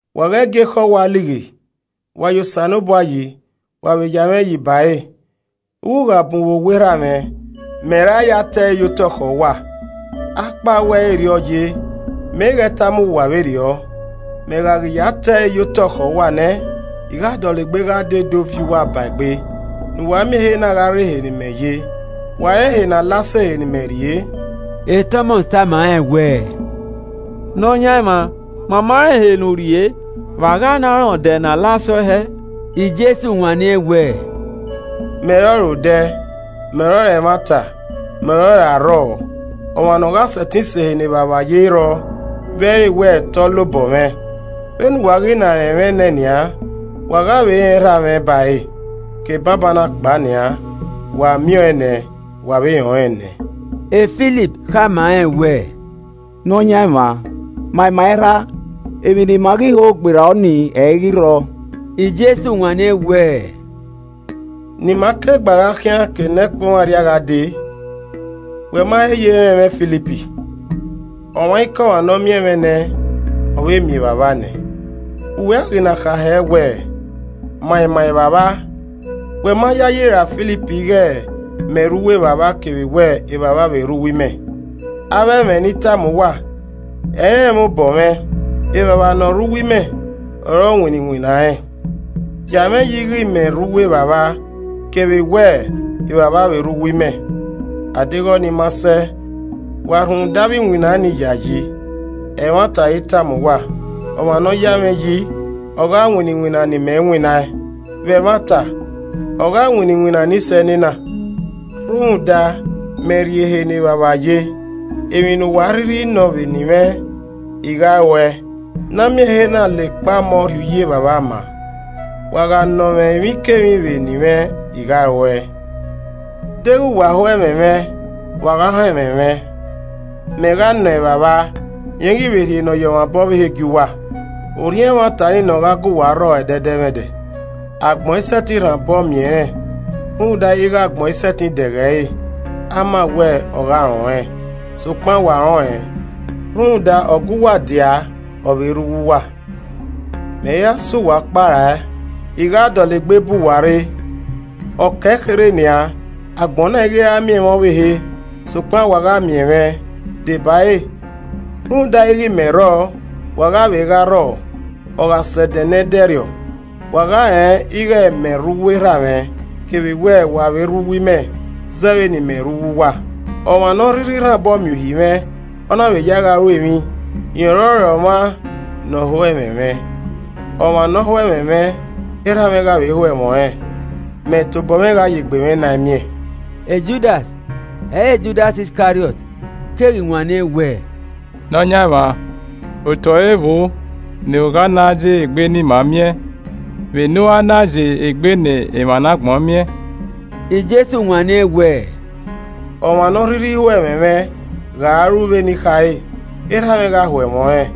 “Wa ghẹ gie ekhọe uwa lighi. Wa ya Osanobua yi. Wa vbe ya mwẹ yi ba ẹre. Ughugha bun vbe owa Erha mwẹ, Mẹ ra ya te ẹre ye otọ khẹ uwa. Akpawẹ ẹ i re erriọ ye, mẹ i ghẹ tama uwa vberriọ. Mẹ gha ghi ya te ẹre ye otọ khẹ uwa nẹ, I gha dọlegbe gha dee do viọ uwa ba egbe, ne uwa miẹn ehe na gha rre ehe ne imẹ ye. Wa rẹn ehe ne a la sẹ ehe ne imẹ rrie.” Tọmọs tama rẹn wẹẹ, “Nọyaẹnmwa, ma ma rẹn ehe ne u rrie, vbe a gha na rẹn odẹ ne a la sẹ ọe hẹẹ?” Jesu wanniẹn wẹẹ, “Mẹ ọrọre odẹ, mẹ ọrọre ẹmwata, mẹ ọrọre arrọọ. Ọmwa nọ gha sẹtin sẹ ehe ne Evbavba ye ẹ i rrọọ vbe ẹ i re wẹ te ọ la obọ mwẹ. Vbene uwa ghi na rẹn mwẹ nẹ nian, wa gha vbe rẹn Erha mwẹ bare. Ke banbanna kpao nian, wa miẹn ọẹn nẹ, wa vbe rẹn ọnrẹn nẹ.” Filip khama rẹn wẹẹ, “Nọyaẹnmwa ma ima Erha, emwi ne ima ghi hi gberra ọnii ẹ i ghi rrọọ.” Jesu wanniẹn wẹẹ, “Ne ima ke gba gha khian ke nẹkpo i mwẹẹ arria gha dee, wẹ ma he ye rẹn mwẹ Filip? Ọmwaikọmwa ne ọ miẹn mwẹ nẹ, ọ vbe miẹn Evbavba nẹ. Vbe uwẹ a ghi na kha hẹ wẹẹ, ‘Ma ima Evbavba.’ Wẹ ma yayi ra Filip ighẹ mẹ rre uwu Evbavba kevbe wẹ Evbavba vbe rre uwu imẹ, avbe ẹmwẹ ne I tama uwa, ẹ i re ẹmwẹ obọ mwẹ, Evbavba ne ọ rre uwu imẹ ọre ọ winna iwinna rẹn. Ya mwẹ yi ighẹ mẹ rre uwu Evbavba kevbe Evbavba vbe rre uwu imẹ, adeghẹ ọnii ma sẹ, wa rhunmwuda avbe iwinna nii yayi. Ẹmwata ọre I tama uwa, ọmwa ne ọ ya mwẹ yi, Ọ gha winna iwinna ne imẹ winnaẹn. Vbe ẹmwata ogha winna iwinna ni sẹ enena, rhunmwuda mẹ rrie ehe ne Evbavba ye. Emwi ne uwa a rhirhi nọ vbe eni mwẹ i ghi ruẹe, ne a miẹn ehe na la ekpa ọmọ rhie uyi Evbavba maa. Wa gha nọ mwẹ emwikemwi vbe eni mwẹ I gha ruẹe. “Deghẹ wa ho ẹmwẹ mwẹ, wa gha họn ẹmwẹ mwẹ. Mẹ gha nọ Evbavba, rẹn ghi vbe rhie Nọyọmwaobọ ọvbehe gie uwa. Orhiọn ẹmwata nii ne ọ gha gu wa rrọ ẹdẹdẹmwẹdẹ. Agbọn i sẹtin rhan obọ miẹn ẹnrẹn rhunmwuda ighẹ agbọn i sẹtin dẹghe ẹre amawẹ, ọ gha rẹn ọnrẹn. Sokpan wa rẹn ọnrẹn, rhunmwuda, ọ gu uwa ọ vbe rre uwu uwa. “Mẹ i ra sẹ uwa ọkpa rae, I gha dọlegbe bu uwa rre. Ọ ke ekherhe nian, agbọn na i ghi ra miẹn mwẹ ọvbehe, sokpan wa gha miẹn mwẹ, debare, rhunmwuda ighe mẹ rrọọ, wa gha vbe gha rrọọ. Ọ gha sẹ ẹdẹ ne ẹdẹrriọ, wa gha rẹn ighẹ mẹ rre uwu Erha mwẹ, kevbe wẹ wa vbe rre uwu imẹ zẹ vbene imẹ rre uwu uwa. Ọmwa ne ọ rhirhi rhan obọ miẹn uhi mwẹ, ọ na vbe ya ẹe gha ru emwi, rẹn ọrọre ọmwa ne ọ ho ẹmwẹ mwẹ. Ọmwa ne ọ ho ẹmwẹ mwẹ, Erha mwẹ gha vbe ho ẹmwẹ ọnrẹn. Mẹ tobọ mwẹ gha ye egbe mwẹ naẹn miẹn.” Judas (ẹ i re Judas Iskariọt) keghi wanniẹn wẹẹ, “Nọyaẹnmwa otọ ẹre vbo ne a gha na ya egbe ne ima miẹn vbene u i ra na ya egbe ne emwa ne agbọn miẹn?” Jesu wanniẹn wẹẹ, “Ọmwa ne ọ rhirhi ho ẹmwẹ mwẹ gha ru vbene I khare, Erha mwẹ gha ho ẹmwẹ ọnrẹn,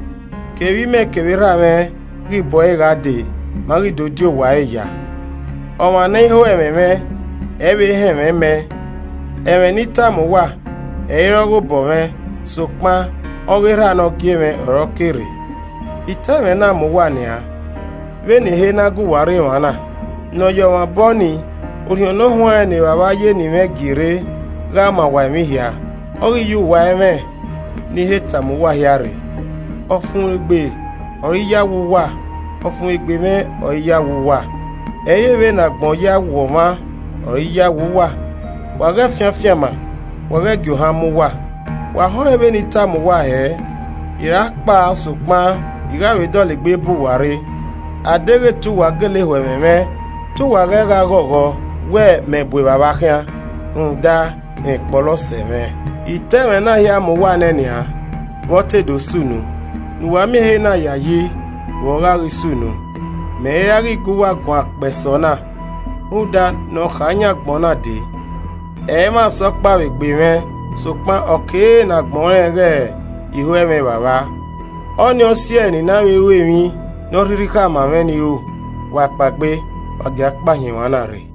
kevbe imẹ kevbe Erha mwẹ ghi bu ẹre gha dee, ma ghi do di owa ẹre ya. Ọmwa ne ẹ i ho ẹmwẹ mwẹ, ẹ i vbe họn ẹmwẹ mẹ. Ẹmwẹ ne I tama uwa, ẹ i re ọghe obọ mwẹ, sokpan ọghe Erha ne ọ gie mwẹ ọre ọ ke rre. “I ta ẹmwẹ na ma uwa nian, vbene I he na gu uwa rre emwa na. Nọyọmwaobọ nii, Orhiọn Ne Ọ Huanrẹn ne Evbavba ye eni mwẹ gie rre gha ma uwa emwi hia, ọ ghi ye uwa ẹmwẹ ne I he tama uwa hia rre. “Ọfumwegbe ọre I ya we uwa, ọfumwegbe mwẹ ọre I ya we uwa, ẹ i re. Vbene agbọn ya we ọmwa ọre I ya we uwa. Wa ghẹ fian afianma, wa ghẹ gie ohan mu uwa. Wa họẹn vbe I tama uwa wẹẹ, ‘I ra kpao sokpan I gha vbe dọlegbe bu uwa rre.’ Adeghẹ te uwa gele ho ẹmwẹ mwẹ te uwa ghẹ gha ghọghọ wẹ mẹ bu Evbavba khian, rhunmwuda, rẹn kpọlọ sẹ mwẹ. I ta ẹmwẹ na hia ma uwa ne nian, vbe ọ te do sunu, ne uwa miẹn ehe na yayi vbe ọ gha ghi sunu. Mẹ i ra ghi gu uwa guan kpẹe sẹ ọna, rhunmwuda, ne ọ kha yan agbọn na dee. Ẹmwẹ asẹ ọkpa vbe egbe mwẹ, sokpan, ọ kere ne agbọn rẹn ghẹ I ho ẹmwẹ Evbavba, ọ ni ọ si ẹe ne I na vbe ru emwi ne ọ rhirhi khama mwẹ ne I ru. “Wa kpaegbe, wa gia kpao hin emwa na rre.”